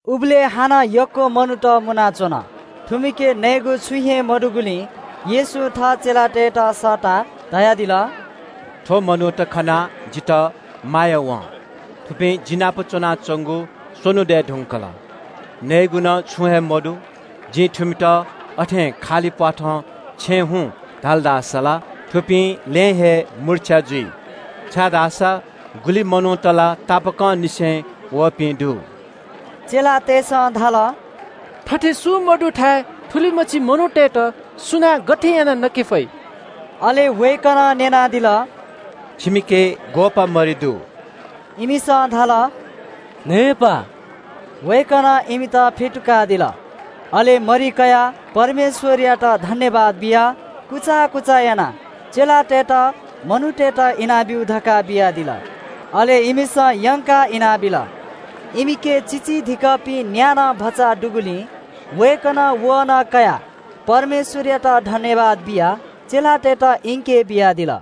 उबलय् हानं ग्‍वाः ग्‍वाः मनूत मुनाच्‍वन। थुमिके नयेगु छुं हे मदुगुलिं येशूं थः चेलातय्‌त सःताः धयादिल – “थ्‍व मनूत खनाः जितः माया वं। थुपिं जि नाप च्‍वनाच्‍वंगु स्‍वन्‍हु दय् धुंकल। नयेगु नं छुं हे मदु। जिं थुमित अथें खालि प्‍वाथं छेँ हुँ धाल धाःसा ला थुपिं लँय् हे मुर्छ्या जुइ, छाय्‌धाःसा गुलि मनूत ला तापाकंनिसें वःपिं दु।” चेलातय्‌सं धाल – “थथे सुं मदुथाय् थुलिमछि मनूतय्‌त सुनां गथे यानाः नके फइ?” अले वय्‌कलं न्‍यनादिल – “छिमिके ग्‍वःपाः मरि दु?” इमिसं धाल – “न्‍हय्‌पाः।” वय्‌कलं इमित फ्‍यतुकादिल। अले मरि कयाः परमेश्‍वरयात सुभाय् बियाः कुचा थलाः चेलातय्‌त मनूतय्‌त इनाब्‍यु धकाः बियादिल। अले इमिसं यंकाः इनाबिल। इमिके चिचीधिकःपिं न्‍या नं भचा दुगुलिं वय्‌कलं व नं कयाः परमेश्‍वरयात सुभाय् बियाः चेलातय्‌त इंके बियादिल।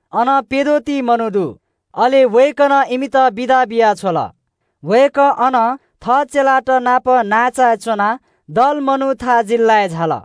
अन प्‍यद्वः ति मनूत दु। अले वय्‌कलं इमित बिदा बियाः छ्वल। वय्‌कः अनं थः चेलात नाप नांचाय् च्‍वनाः दलमनुथा जिल्‍लाय् झाल।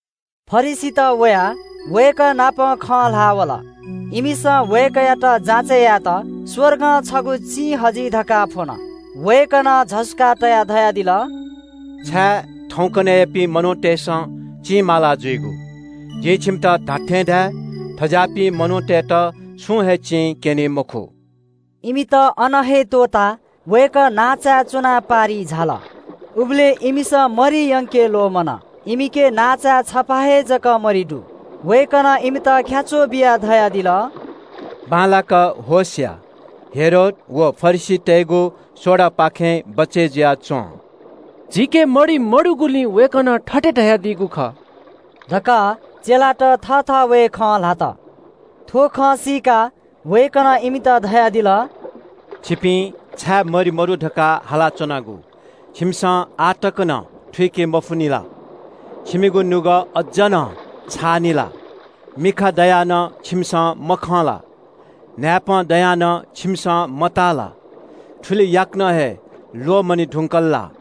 फरिसीत वयाः वय्‌कः नाप खँ ल्‍हाः वल। इमिसं वय्‌कःयात जाँचय् यायेत स्‍वर्गं छगू चिं हजि धकाः फ्‍वन। वय्‌कलं झसुकाः तयाः धयादिल – “छाय् थौंकन्‍हय्‌यापिं मनूतय्‌सं चिं माला जुइगु? जिं छिमित धात्‍थें धाये – थज्‍याःपिं मनूतय्‌त छुं हे चिं क्‍यनी मखु।” इमित अन हे त्‍वःताः वय्‌कः नांचाय् च्‍वनाः पारिइ झाल। उबलय् इमिसं मरि यंके ल्‍वःमन। इमिके नांचाय् छपा हे जक मरि दु। वय्‌कलं इमित ख्‍याच्‍वः बियाः धयादिल – “बांलाक होश या, हेरोद व फरिसीतय्‌गु सोडापाखें बचय् जुयाच्‍वँ।” “झीके मरि मदुगुलिं वय्‌कलं थथे धयादीगु खः?” धकाः चेलात थःथवय् खँ ल्‍हात। थ्‍व खँ सीकाः वय्‌कलं इमित धयादिल – “छिपिं छाय् मरि मदु धकाः हालाच्‍वनागु? छिमिसं आः तक नं थुइके मफुनि ला? छिमिगु नुगः अज्‍ज नं छाःनि ला? मिखा दयाः नं छिमिसं मखं ला? न्‍हाय्‌पं दयाः नं छिमिसं मताः ला? थुलि याकनं हे ल्‍वःमने धुंकल ला?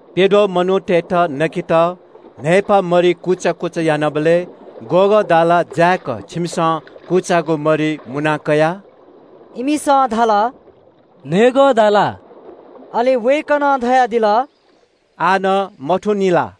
“प्‍यद्वः मनूतय्‌त नकेत जिं न्‍हय्‌पाः मरि छिमित इनाबीत बियाबलय् ग्‍वःगः दाला ल्‍यं दत?” इमिसं धाल – “न्‍हय्‌गः दाला।” अले वय्‌कलं धयादिल – “आः नं मथूनि ला?”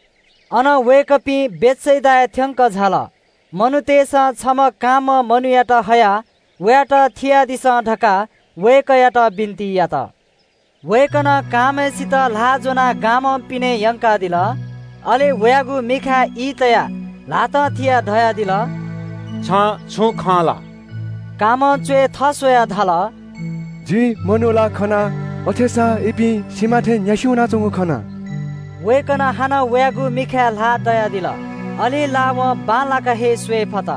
अनं वय्‌कःपिं बेथसेदाय् थ्‍यंकः झाल। मनूतय्‌सं छम्‍ह कांम्‍ह मनूयात हयाः वयात थियादिसँ धकाः वय्‌कःयात बिन्‍ति यात। वय्‌कलं कांम्‍हय्‌सित ल्‍हाः ज्‍वनाः गामं पिने यंकादिल। अले वयागु मिखाय् ई तयाः ल्‍हातं थियाः धयादिल – “छं छुं खं ला?” कांम्‍हं च्‍वय् थस्‍वयाः धाल – “जिं मनू ला खना अथेसां इपिं सिमा थें न्‍यासि वनाच्‍वंगु खना।” वय्‌कलं हानं वयागु मिखाय् ल्‍हाः तयादिल। अले ला वं बांलाक हे स्‍वये फत,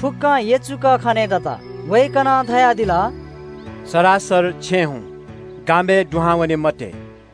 फुक्‍कं यचुक खनेदत। वय्‌कलं धयादिल – “सरासर छेँ हुँ, गामय् दुहां वने मते।”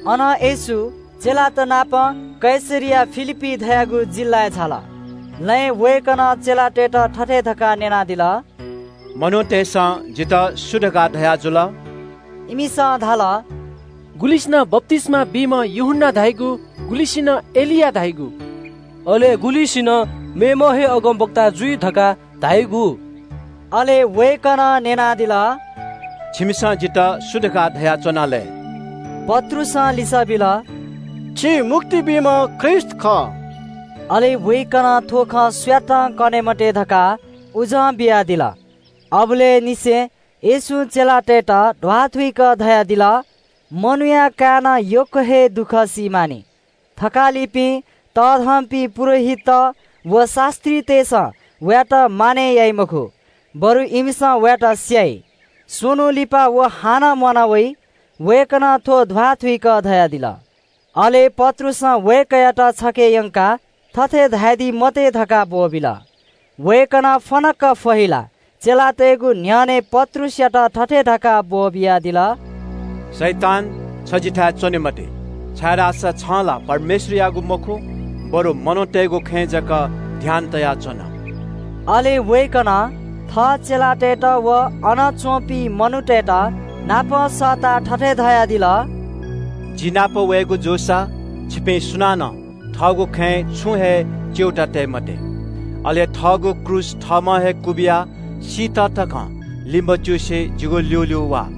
अनं येशू चेलातनापं कैसरिया फिलिप्‍पी धाःगु जिल्‍लाय् झाल। लँय् वय्‌कलं चेलातय्‌त थथे धकाः न्‍यनादिल – “मनूतय्‌सं जितः सु धकाः धयाजुल?” इमिसं धाल – “गुलिसिनं बप्‍तिस्‍मा बीम्‍ह यूहन्‍ना धाइगु,” गुलिसिनं “एलिया धाइगु, अले गुलिसिनं मेम्‍ह हे अगमवक्ता जुइ धकाः धाइगु।” अले वय्‌कलं न्‍यनादिल – “छिमिसं जितः सु धकाः धयाच्‍वना लय्?” पत्रुसं लिसः बिल – “छि मुक्ति बीम्‍ह ख्रीष्‍ट खः।” अले वय्‌कलं थ्‍व खँ सुयातं कने मते धकाः आज्ञा बियादिल। अबलय् निसें येशूं चेलातय्‌त ध्‍वाथुइक धयादिल – “मनूया काय्‌नं यक्‍व हे दुःख सी मानि। थकालिपिं, तःधंपिं पुजाहारीत व शास्‍त्रीतय्‌सं वयात मानय् याइ मखु, बरु इमिसं वयात स्‍याइ। स्‍वन्‍हु लिपा व हानं म्‍वाना वइ।” वय्‌कलं थ्‍व ध्‍वाथुइक धयादिल। अले पत्रुसं वय्‌कःयात छखे यंकाः थथे धयादी मते धकाः ब्‍वःबिल। वय्‌कलं फनक्‍क फहिलाः चेलातय्‌त स्‍वयाः पत्रुसयात थथे धकाः हक्‍कादिल – “शैतान, छ जिगु न्‍ह्यःने च्‍वने मते, छाय्‌धाःसा छं ला परमेश्‍वरयागु खँय् मखु, बरु मनूतय्‌गु खँय् जक ध्‍यान तयाच्‍वन।” अले वय्‌कलं थः चेलातय्‌त व अन च्‍वंपिं मनूतय्‌तनापं सःताः थथे धयादिल – “जि नाप वयेगु जूसा छिपिं सुनानं थःगु खँय् छुं हे च्‍यूताः काये मते। अले थःगु क्रूस थःम्‍हं हे क्‍वबिया सीत तकं लिमच्‍युसे जिगु ल्‍यूल्‍यू वा।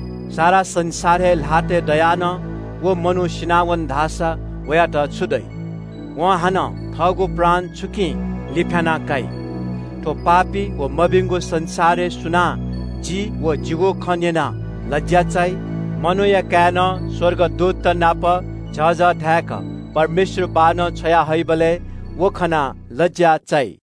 सारा संसार हे ल्‍हातय् दयाः नं व मनू सिनावन धाःसा वयात छु दइ? वं हानं थःगु प्राण छुकिं लिफ्‍याना काइ? थ्‍व पापी व मभिंगु संसारय् सुनां जि व जिगु खँ न्‍यनाः ख्‍वाः फस्‍वय्‌की मनूया काय्‌नं स्‍वर्गदूतत नाप झःझः धाय्‌क परमेश्‍वर बाःनं छ्वया हइबलय् व खनाः लज्‍या चाइ।”